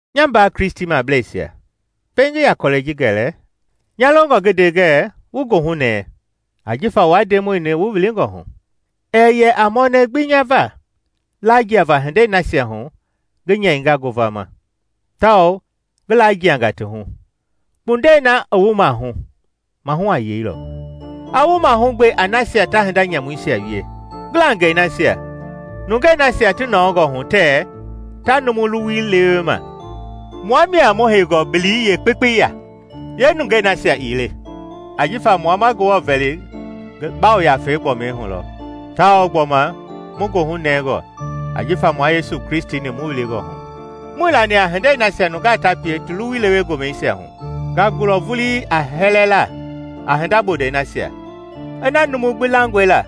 Nya mbaa Kristimableisia, pɛiŋ ngi yaa kɔlɛi ji gɛlɛ, nya longɔ ngi nde ngɛɛ wu goohunɛɛ jifa wua Ndemɔi-ni wu wilingɔ hu. Ɛɛ yɛ a mɔnɛ gbi nya va lajiava hindei nasia hu ngi nyɛinga ngovama, tawao ngi lajiangaa ti hu, kpundɛi na i wu mahu, mahu a yeilɔ. A wu mahugbe a nasia ta hinda nyamuisia wie, ngilangɛi nasia, nungei nasia ti nɔɔngɔ hu tɛɛ kɛ ta numu luwui lewe ma. Mua mia mu heingɔ bili yeekpekpei ya, yeenungei nasia ii le, ajifa mua ma Ngewɔ vɛli ngi Yafei gbɔmi hu lɔ, tawao gbɔma mu goohu nɛngɔ jifa mua Yesu Kristi-ni mu wilingɔ hu. Muii lani a hindei nasia nungaa ta pie ti luwui lewe gomɛisia hu. Nga gulɔ vulii a hɛlɛla a hinda bondɛi nasia. Ina numu gbi langɔe la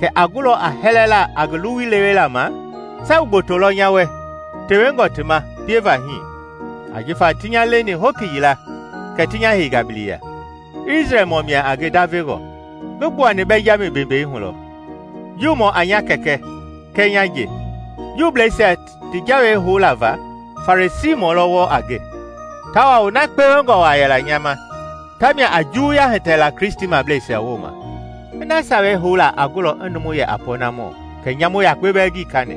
kɛ a gulɔ a hɛlɛla a ngi luwui lewela ma, sabu gboto lɔ nya wɛ tewengɔ ti ma pieva hii. Ajifa ti nya leni hoki yila kɛ ti nya heinga bili ya, Isrɛlmɔ mia a nge ndavengɔ, ngi gbuani Bɛnjami bembei hu lɔ, Juumɔ a nya kɛkɛ kɛɛ nya nje. Juubleisia ti Jawei houla va, Farisiimɔ lɔ wɔɔ a nge, tawao na kpewengɔ waa yɛla nya ma, tamia a juwuya hitɛ la Kristimableisia wooma. Ina Sawei houla a gulɔ i numu yɛ a pɔɔnamɔ, kɛ nyamu yakpe bɛɛ ngii kani.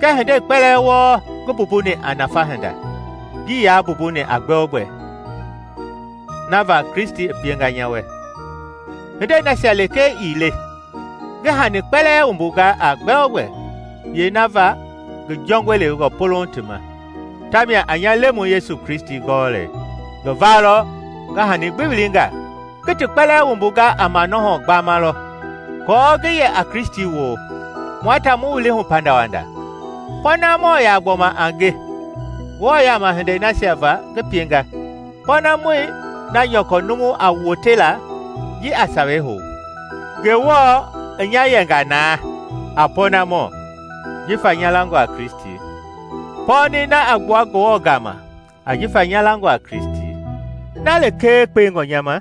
Kɛɛ hindei kpɛlɛɛ wɔɔ ngi mbumbuni a nafa hinda, ngii yaa mbumbuni a gbɛogbɛ na va Kristi i pienga nya wɛ. Hindei nasia lekee ii le, ngi hani kpɛlɛɛ wumbunga a gbɛ-o-gbɛ yee na va ngi jɔngɔi lewengɔ polouŋ ti ma, tamia a nya Lemɔi Yesu Kristi gɔlɛi. Ngi va lɔ ngi hani gbi wilinga; ngi ti kpɛlɛɛ wumbunga a manɔhɔ gbama lɔ, aako ngi yɛ a Kristi woo, mua ta mu wili hu pandawanda. Pɔɔnamɔ yaa gbɔma a nge Ngewɔ yama hindei nasia va ngi pienga, pɔɔnamɔi na nyɔkɔ numu a wote la ji a Sawei hou. Ngewɔ i nya yɛnga na a pɔɔnamɔ jifa nya langɔ a Kristi; pɔɔni na a gbua Ngewɔ gama jifa nya langɔ a Kristi. Na lekee kpewengɔ nya ma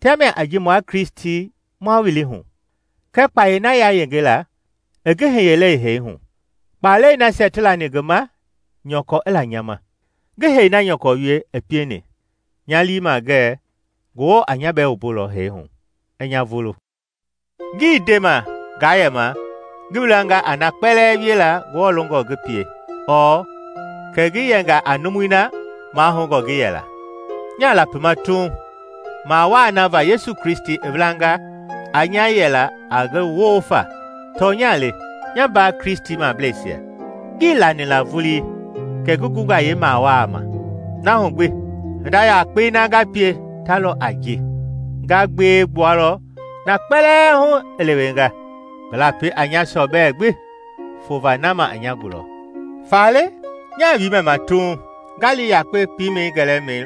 tamia a ji mua Kristi ma wili hu, kɛɛ kpayei na yayenge i ngi hiyengɔi hu hee hu, kpaalɛi nasia ti lani ngi ma, nyɔkɔ i la nya ma, ngi hee na nyɔkɔ wie i pieni, nya lii ma ngɛɛ Ngewɔ a nya bɛɛ wumbulɔ hee hu i nya vulu. Ngii ndema ngaa yɛma ngi wilanga a na kpɛlɛɛ wiela Ngewɔ longɔ ngi pie ɔɔ kɛ ngi yɛnga a numui na mahoungɔ ngi yɛla. Nya lapima tuuŋ mawaa na va Yesu Kristi i welanga a nya yɛla a ngi woo fa. Tɔnya le, nya mbaa Kristimableisia, ngii lani la vulii kɛ ngi gunga yeemawaa ma; na hu gbi hinda yakpei na nga pie ta lɔ a ji nga gbewe gbua lɔ na kpɛlɛɛ hu i lewenga, ngi lapi a nya sɔbɛ gbi fova na ma i nya gulɔ. Faale, nyaa wiimɛ ma tuuŋ nga li yakpe piimɛi gɛlɛmɛi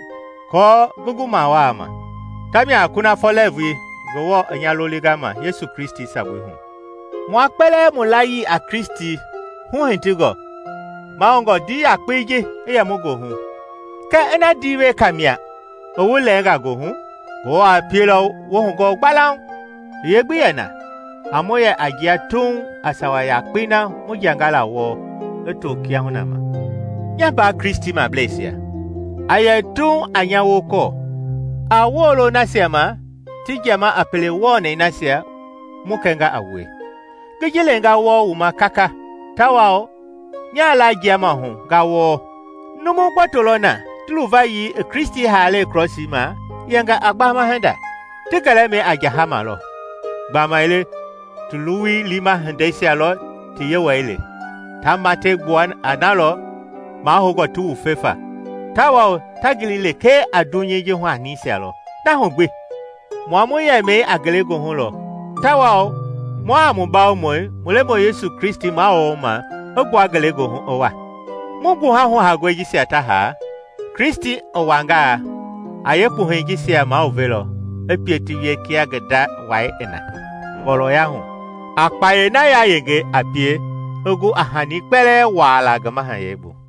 aako ngi gu mawaa ma, tamia a kunafɔ lɛɛvui Ngewɔ i nya lolinga ma Yesu Kristi sabui hu. Mua kpɛlɛɛ mu layii a Kristi huhitingɔ, mahoungɔ ndii yakpe ji i yɛ mu goohu. Kɛɛ ina ndii weka mia i wu lɛɛngaa goohu, Ngewɔ a pielɔ wu hugɔɔ gbalauŋ. I yee gbi yɛna, a mu yɛ a jia tuuŋ a sawa yakpei na mu jianga la wɔɔ i to kiahuna ma. Nya mbaa Kristimableisia, a yɛ tuuŋ a nya wokɔɔ. A woolo nasia ma ti jiama a pele wɔnɛi nasia mu kɛnga a wue. Ngi ji lenga wɔɔ wu ma kaka, tawao nyaa laajiama hu nga wɔɔ; numu gboto lɔ na ti luvayii i Kristi haalɛi krɔsii ma yɛnga a gbama hinda. Ti gɛlɛmɛi a jahama lɔ, gbamaile ti luwui liima hindeisia lɔ ti yewɔɛi le. Ta matɛi gbua a na lɔ mahoungɔ ti wufe fa, tawao ta gili lekee a dunyei ji hu hanisia lɔ. Na hu gbi, mua mu yɛmii a ngelegoohu lɔ tawao mua mu Bawomɔi, mu Lemɔi Yesu Kristi mawuloma, i gbua ngelegoohu i wa. Mu gbuha huhaangɔi jisia ta haa, Kristi i wangaa a yeekpuhɛi jisia maluvelɔ i pie ti wie kia ngi nda wai i na ngɔlɔya hu, a kpayei na yayenge a pie i gu a hani kpɛlɛɛ wuaala ngi mahayɛi bu.